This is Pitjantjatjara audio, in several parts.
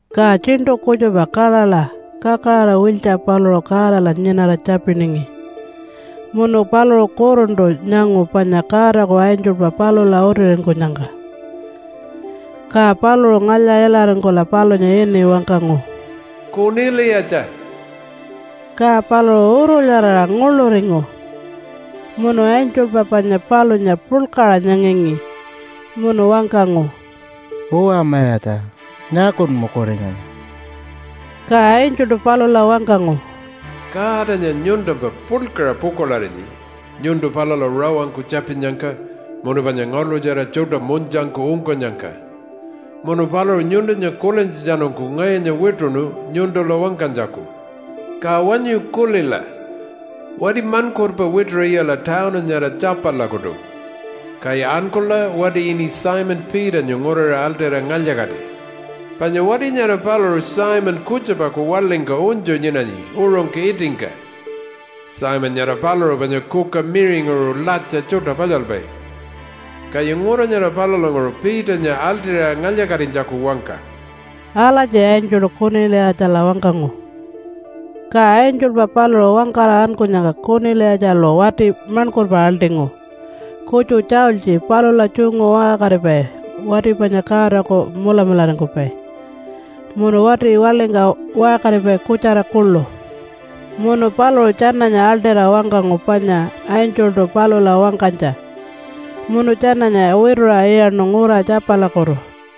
Ka tjiṉṯu kutjupa kaḻaḻa kakaraṟa-wiltja paluṟu Godala nyinara tjapiningi, munu paluṟu kuruntu nyangu panya Godaku angelpa palula utiringkunyangka. Ka paluṟu ngalya-ilaringkula palunya ini wangkangu, “Kuniliyatja!” Ka paluṟu urulyaraṟa nguḻuringu munu angelpa panya palunya puḻkaṟa nyangangi, munu wangkangu, “Uwa mayatja! Nyaakun mukuringanyi?” Ka angeltu palula wangkangu, “Godanya nyuntumpa puḻkaṟa pukuḻarinyi nyuntu palula rawangku tjapinnyangka munu panya ngaḻṯutjara tjuṯa munytjangku ungkunyangka. Munu paluṟu nyuntunya kulintjatjanungku ngayunya wituṉu nyuntula wangkanytjaku. Ka wanyu kulila! Wati maṉkurpa wituṟa iyala tawunu nyara Tjapalakutu, kaya ankula wati ini Simon Peternya nguriṟa aḻṯira ngalya-kati. Panya wati nyara paluṟu Simon kutjupaku waḻingka unytju nyinanyi uṟungka itingka. Simon nyara paluṟu panya kuka miṟinguṟu latja tjuṯa palyalpai. Kaya ngura nyara palulanguṟu Peternya aḻṯira ngalya-katinytjaku wangka!” Alatji angeltu Kuniliyatjala wangkangu. Ka angelpa paluṟu wangkara ankunyangka Kuniliyatjalu wati maṉkurpa aḻṯingu, kutju tjaultji palula tjungu waṟkaripai wati panya Godaku mulamularingkupai, munu wati waḻingka waṟkaripai kutjara kuḻu. Munu paluṟu tjananya aḻṯira wangkangu panya angeltu palula wangkanytja munu tjananya wituṟa iyaṉu ngura Tjapalakutu.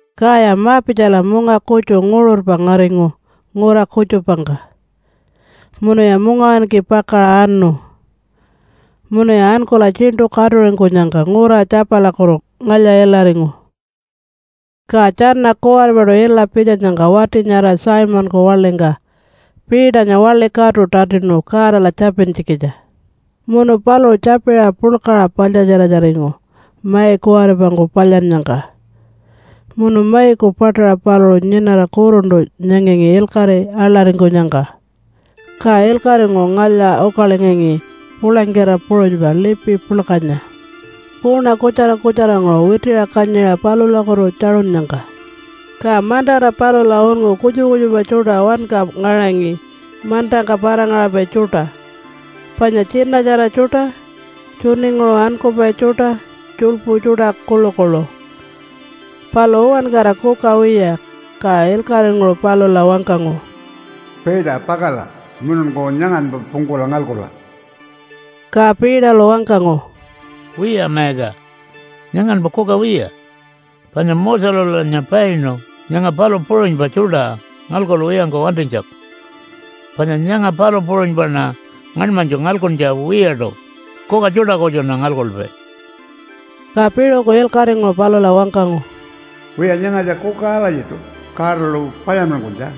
Kaya ma-pitjala munga kutju nguṟurpa ngaringu ngura kutjupangka, munuya mungawinki pakaṟa anu munuya ankula tjiṉṯu katuringkunyangka ngura Tjapalakutu ngalya-ilaringu. Ka tjana kuwaripaṯu ila pitjanyangka wati nyara Simonku waḻingka Peternya waḻi katu tatinu Godala tjapintjikitja. Munu paluṟu tjapiṟa puḻkaṟa paḻtjatjiratjaringu mai kuwaripangku palyannyangka munu maiku paṯaṟa paluṟu nyinara kuruntu nyangangi ilkaṟi aḻaringkunyangka. Ka ilkaṟinguṟu ngalya-ukalingangi pulangkita puṟunypa lipi puḻkanya kuuna kutjara kutjaranguṟu witiṟa kanyiṟa palulakutu tjaṟunnyangka. Ka mantara palula unngu kutjupa kutjupa tjuṯa wanka ngaṟangi mantangka para-ngaṟapai tjuṯa, panya tjinatjara tjuṯa, tjuninguṟu ankupai tjuṯa, tjuḻpu tjuṯa kuḻukuḻu, palu uwankara kuka wiya. Ka ilkaṟinguṟu palula wangkangu, “Peter! Pakala mununku nyanganpa pungkula ngalkula!” Ka Peterlu wangkangu, “Wiya Mayatja, nyanganpa kuka wiya! Panya Moselulanya painu nyanga palu puṟunypa tjuṯa ngalkuwiyangku wantinytjaku. Panya nyanga palu puṟunypaṉa ngaṉmanytju ngalkuntja wiyaṯu, kuka tjuṯa kutjuṉa ngalkupai.” Ka piṟuku ilkaṟinguṟu palula wangkangu, “Wiya, nyangatja kuka alatjiṯu Godalu palyanmankunytja,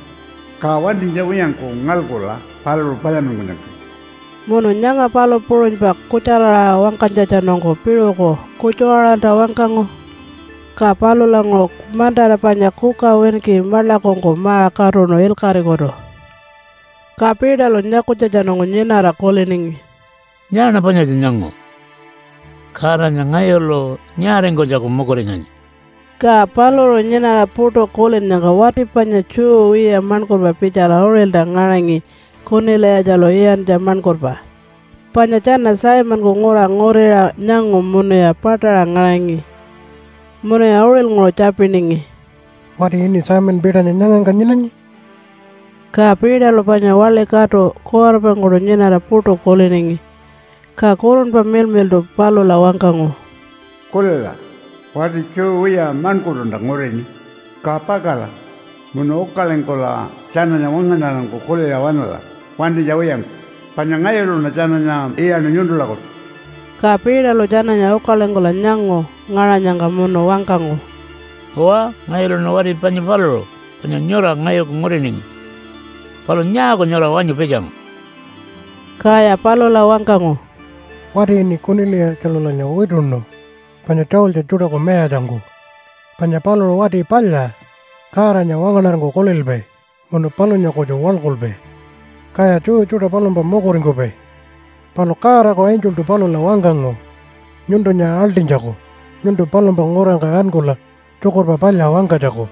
ka wantinytja wiyangku ngalkula paluṟu palyanmankunyangka.” Munu nyanga palu puṟunypa kutjara-aṟa wangkanytjatjanungku piṟuku kutju-aṟalta wangkangu. Ka palulanguṟu mantara panya kuka winki maḻakungku ma-katuṉu ilkaṟikutu. Ka Peterlu nyakunytjatjanungku nyinara kuliningi, “Nyaaṉa panyatja nyangu? Godanya ngayulu nyaaringkunytjaku mukuringanyi?” Ka paluṟu nyinara puṯu kulinnyangka wati panya Jew wiya maṉkurpa pitjala uṟilta ngaṟangi Kuniliyatjalu iyantja maṉkurpa, panya tjana Simonku ngura nguriṟa nyangu munuya paṯaṟa ngaṟangi. Munuya uṟilnguṟu tjapiningi, “Wati ini Simon Peternya nyangangka nyinanyi?” Ka Peterlu panya waḻi katu kuwaripangkuṯu nyinara puṯu kuliningi, ka Kurunpa Miḻmiḻṯu palula wangkangu, “Kulila! Wati Jew wiya maṉkurtunta ngurini. Ka pakala munu ukalingkula tjananya wangaṉarangku kuliṟa waṉala wantinytja wiyangku, panya ngayuluṉa tjananya iyaṉu nyuntulakutu.” Ka Peterlu tjananya ukalingkula nyangu ngaṟanyangka munu wangkangu, “Uwa, ngayuluṉa wati panya paluṟu panya nyura ngayuku nguriningi. Palu nyaaku nyura wanyu pitjangu?” Kaya palula wangkangu, “Wati ini Kuniliyatjalulanya wituṉu panya tjaultji tjuṯaku mayatjangku. Panya paluṟu wati palya Godanya wangaṉarangku kulilpai munu palunya kutju waḻkulpai. Kaya Jew tjuṯa palumpa mukuringkupai. Palu Godaku angeltu palula wangkangu nyuntunya aḻṯinytjaku nyuntu palumpa ngurangka ankula Tjukurpa Palya wangkanytjaku.”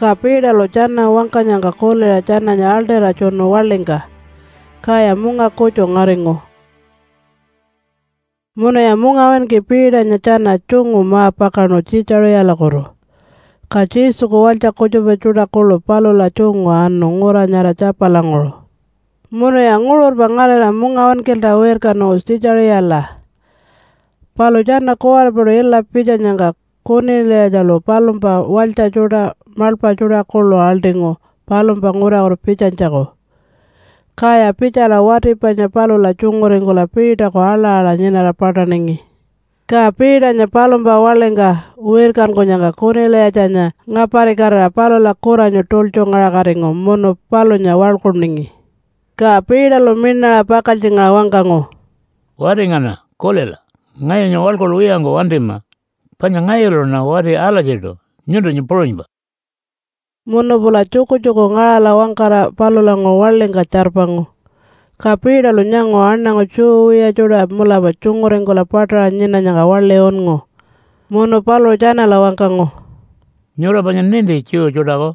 Ka Peterlu tjana wangkanyangka kuliṟa tjananya aḻṯira tjunu waḻingka, kaya munga kutju ngaringu. Munuya mungawinki Peternya tjana tjungu ma-pakaṉu Tjiitjaṟiyalakutu, ka Jesuku walytja kutjupa tjuṯa kuḻu palula tjungu anu ngura nyara Tjapalanguṟu. Munuya nguṟurpa ngarira mungawinkilta wirkanu Tjiitjaṟiyala. Palu tjana kuwaripaṯu ila pitjanyangka Kuniliyatjalu palumpa walytja tjuṯa, maḻpa tjuṯa kuḻu aḻṯingu palumpa ngurakutu pitjanytjaku, kaya pitjala wati panya palula tjunguringkula Peterku aḻa-aḻa nyinara paṯaningi. Ka Peternya palumpa waḻingka wirkankunyangka Kuniliyatjanya ngaparikatira palula kuranyu tultjungaṟakatingu munu palunya waḻkuningi. Ka Peterlu miṉaṟa pakaltjingaṟa wangkangu, “Wati ngana! Kulila! Ngayunya waḻkulwiyangku wantima, panya ngayuluṉa wati alatjiṯu nyuntunya puṟunypa.” Munu pula tjukutjuku ngaṟala wangkara palulanguṟu waḻingka tjarpangu, ka Peterlu nyangu aṉangu Jew wiya tjuṯa mulapa tjunguringkula paṯaṟa nyinanyangka waḻi unngu. Munu paluṟu tjanala wangkangu, “Nyura panya ninti Jew tjuṯaku,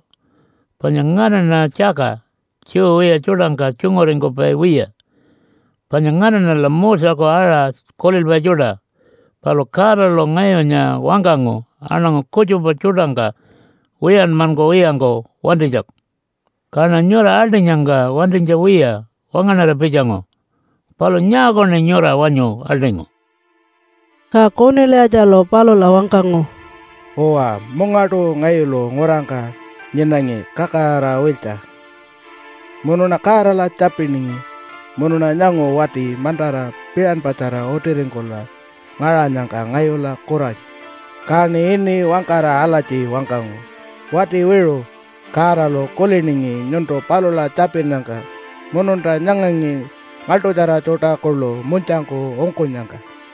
panya nganaṉa tjaka Jew wiya tjuṯangka tjunguringkupai wiya, panya nganaṉala Moseku aṟa kulilpai tjuṯa. Palu Godalu ngayunya wangkangu aṉangu kutjupa tjuṯangka wiyanmankuwiyangku wantinytjaku. Kaṉa nyura aḻṯinyangka wantinytja wiya wangaṉara pitjangu. Palu nyaakuṉi nyura wanyu aḻṯingu?” Ka Kuniliyatjalu palula wangkangu, “Uwa, mungaṯu ngayulu ngurangka nyinangi kakaraṟa-wiltja, munuṉa Godala tjapiningi, munuṉa nyangu wati mantara piṟanpatjara utiringkula ngaṟanyangka ngayula kuranyu. Kaṉi ini wangkara alatji wangkangu, ‘Wati wiṟu! Godalu kuliningi nyuntu palula tjapinnyangka mununta nyangangi ngaḻṯutjara tjuṯa kuḻu munytjangku ungkunyangka.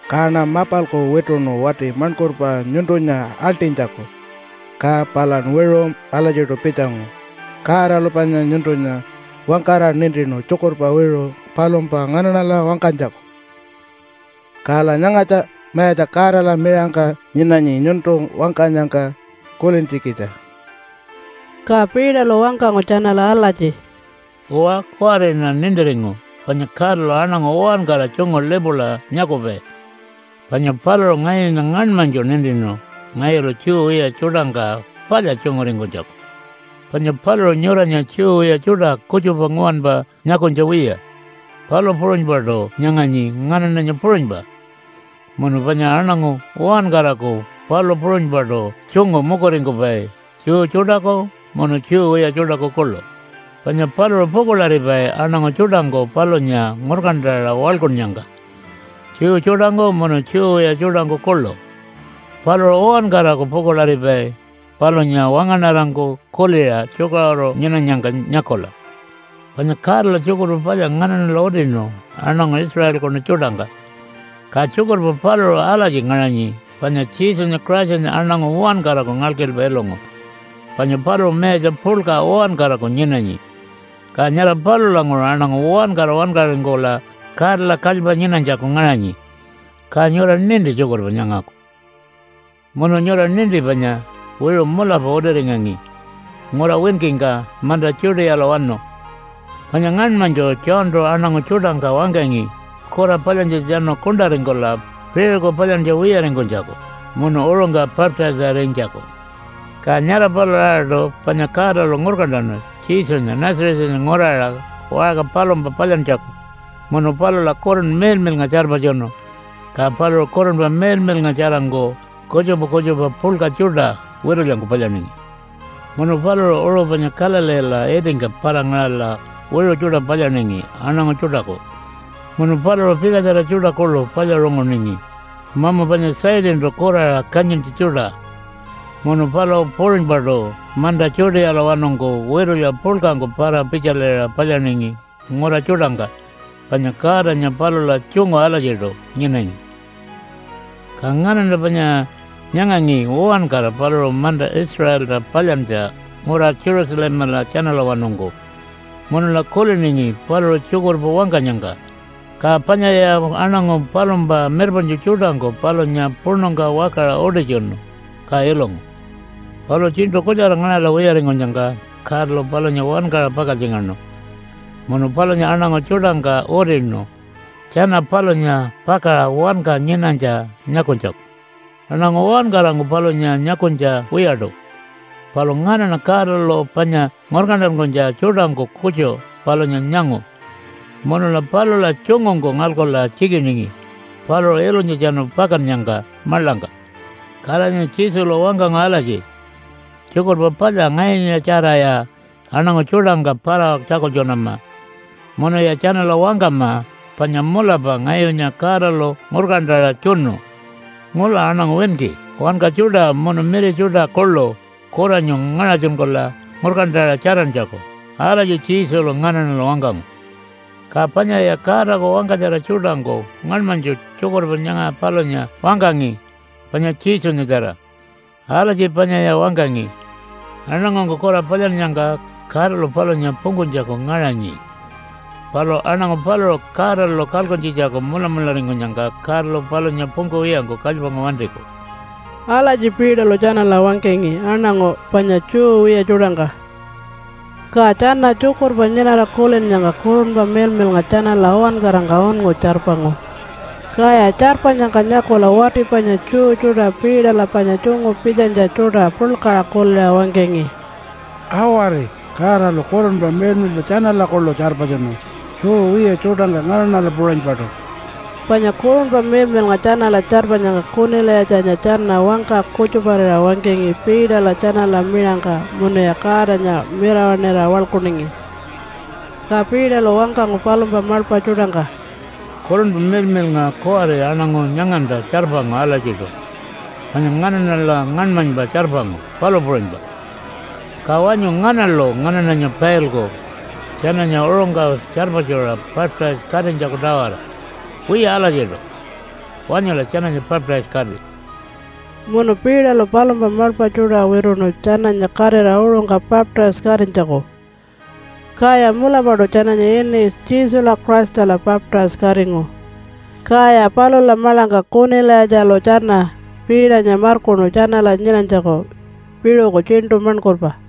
Kaṉa mapalku wituṉu wati maṉkurpa nyuntunya aḻṯinytjaku, ka palan wiṟu alatjiṯu pitjangu. Godalu panya nyuntunya wangkara nintinu tjukurpa wiṟu palumpa nganaṉala wangkanytjaku, kala nyangatja Mayatja Godala miṟangka nyinanyi nyuntu wangkanyangka kulintjikitja.” Ka Peterlu wangkangu tjanala alatji, “Uwa, kuwariṉa nintiringu panya Godalu aṉangu uwankara tjungu lipula nyakupai, panya paluṟu ngayunya ngaṉmanytju nintinu ngayulu Jew wiya tjuṯangka palya tjunguringkunytjaku. Panya paluṟu nyuranya Jew wiya tjuṯa kutjupa nguwanpa nyakunytja wiya, palu puṟunypaṯu nyanganyi nganaṉanya puṟunypa, munu panya aṉangu uwankaraku palu puṟunypaṯu tjungu mukuringkupai Jew tjuṯaku munu Jew wiya tjuṯaku kuḻu. Panya paluṟu pukuḻaripai aṉangu tjuṯangku palunya ngurkantaṟa waḻkunnyangka, Jew tjuṯangku munu Jew wiya tjuṯangku kuḻu. Paluṟu uwankaraku pukuḻaripai palunya wangaṉarangku kuliṟa tjukaṟuru nyinanyangka nyakula. Panya Godalu Tjukurpa Palya nganaṉala utinu aṉangu Israelkunu tjuṯangka. Ka tjukurpa paluṟu alatji ngaṟanyi panya Jesunya Christanya aṉangu uwankaraku ngalkilpa ilungu, panya paluṟu mayatja puḻka uwankaraku nyinanyi, ka nyara palulanguṟu aṉangu uwankara wankaringkula Godala kalypa nyinanytjaku ngaṟanyi. Ka nyura ninti tjukurpa nyangaku. “Munu nyura ninti panya wiṟu mulapa utiringangi ngura winkingka manta Judealawanu, panya ngaṉmanytju Johntu aṉangu tjuṯangka wangkangi kura palyantjatjanu kuṉṯaringkula piṟuku palyantja wiyaringkunytjaku munu uṟungka baptise-arinytjaku. Ka nyara palula-aṟaṯu panya Godalu ngurkantanu Jesunya Nazarethanya nguraṟa waṟka palumpa palyantjaku munu palula Kurunpa Miḻmiḻnga tjarpatjunu ka paluṟu Kurunpa Miḻmiḻngatjarangku kutjupa kutjupa puḻka tjuṯa witulyangku palyaningi. Munu paluṟu uṟu panya Galileela itingka para-ngaṟala wiṟu tjuṯa palyaningi aṉangu tjuṯaku munu paluṟu pikatjara tjuṯa kuḻu palyaṟunguningi mamu panya Satantu kuraṟa kanyintja tjuṯa. Munu palu puṟunypaṯu manta Judealawanungku witulya puḻkangku para-pitjaliṟa palyaningi ngura tjuṯangka, panya Godanya palula tjungu alatjiṯu nyinangi. “Ka nganaṉa panya nyangangi uwankara paluṟu manta Israelta palyantja ngura Jerusalemala tjanalawanungku munula kuliningi paluṟu tjukurpa wangkanyangka. Ka panyaya aṉangu palumpa mirpaṉtju tjuṯangku palunya puṉungka wakaṟa utitjunu, ka ilungu. Palu tjiṉṯu kutjara ngaṟala wiyaringkunyangka Godalu palunya wankaṟa pakaltjingaṉu, munu palunya aṉangu tjuṯangka utinu tjana palunya pakaṟa wanka nyinanytja nyakunytjaku. Aṉangu uwankarangku palunya nyakunytja wiyaṯu, palu nganaṉa Godalu panya ngurkantankunytja tjuṯangku kutju palunya nyangu, munula palula tjungungku ngalkula tjikiningi paluṟu ilunytjatjanu pakannyangka maḻangka. Kalanya Jesulu wangkangu alatji, ‘Tjukurpa Palya ngayunyatjaraya aṉangu tjuṯangka para-tjakultjunama, munuya tjanala wangkama panya mulapa ngayunya Godalu ngurkantaṟa tjunu ngula aṉangu winki wanka tjuṯa munu miri tjuṯa kuḻu kuranyu ngaṟatjunkula ngurkantaṟa tjarantjaku.’ Alatji Jesulu nganaṉala wangkangu. Ka panyaya Godaku wangkatjara tjuṯangku ngaṉmanytju tjukurpa nyanga palunya wangkangi panya Jesunyatjara. Alatji panyaya wangkangi, ‘Aṉangungku kura palyannyangka Godalu palunya pungkunytjaku ngaṟanyi. Palu aṉangu paluṟu Godalu kalkuntjitjaku mulamularingkunyangka Godalu palunya pungkuwiyangku kalypangku wantiku.’” Alatji Peterlu tjanala wangkangi aṉangu panya Jew wiya tjuṯangka. Ka tjana tjukurpa nyinara kulinnyangka Kurunpa Miḻmiḻnga tjanala uwankarangka unngu tjarpangu. Kaya tjarpanyangka nyakula wati panya Jew tjuṯa Peterla panya tjungu pitjanytja tjuṯa puḻkaṟa kuliṟa wangkangi, “Awari! Godalu Kurunpa Miḻmiḻnga tjanala kuḻu tjarpatjunu Jew wiya tjuṯangka nganaṉala puṟunypaṯu.” Panya Kurunpa Miḻmiḻnga tjanala tjarpanyangka Kuniliyatjanya tjana wangka kutjuparira wangkangi Peterla tjanala miṟangka munuya Godanya mirawaṉira waḻkuningi. Ka Peterlu wangkangu palumpa maḻpa tjuṯangka, “Kurunpa Miḻmiḻnga kuwari aṉangu nyanganta tjarpangu alatjiṯu, panya nganaṉala ngaṉmanypa tjarpangu, palu puṟunypa. Ka wanyu nganalu nganaṉanya pailku tjananya uṟungka tjarpatjuṟa baptise-katinytjaku-tawara? Wiya alatjiṯu. Wanyula tjananya baptise-kati!” Munu Peterlu palumpa maḻpa tjuṯa wituṉu tjananya katira uṟungka baptise-katinytjaku. Kaya mulapaṯu tjananya ini Jesula Christala baptise-katingu. Kaya palula maḻangka Kuniliyatjalu tjana Peternya markuṉu tjanala nyinanytjaku piṟuku tjiṉṯu maṉkurpa.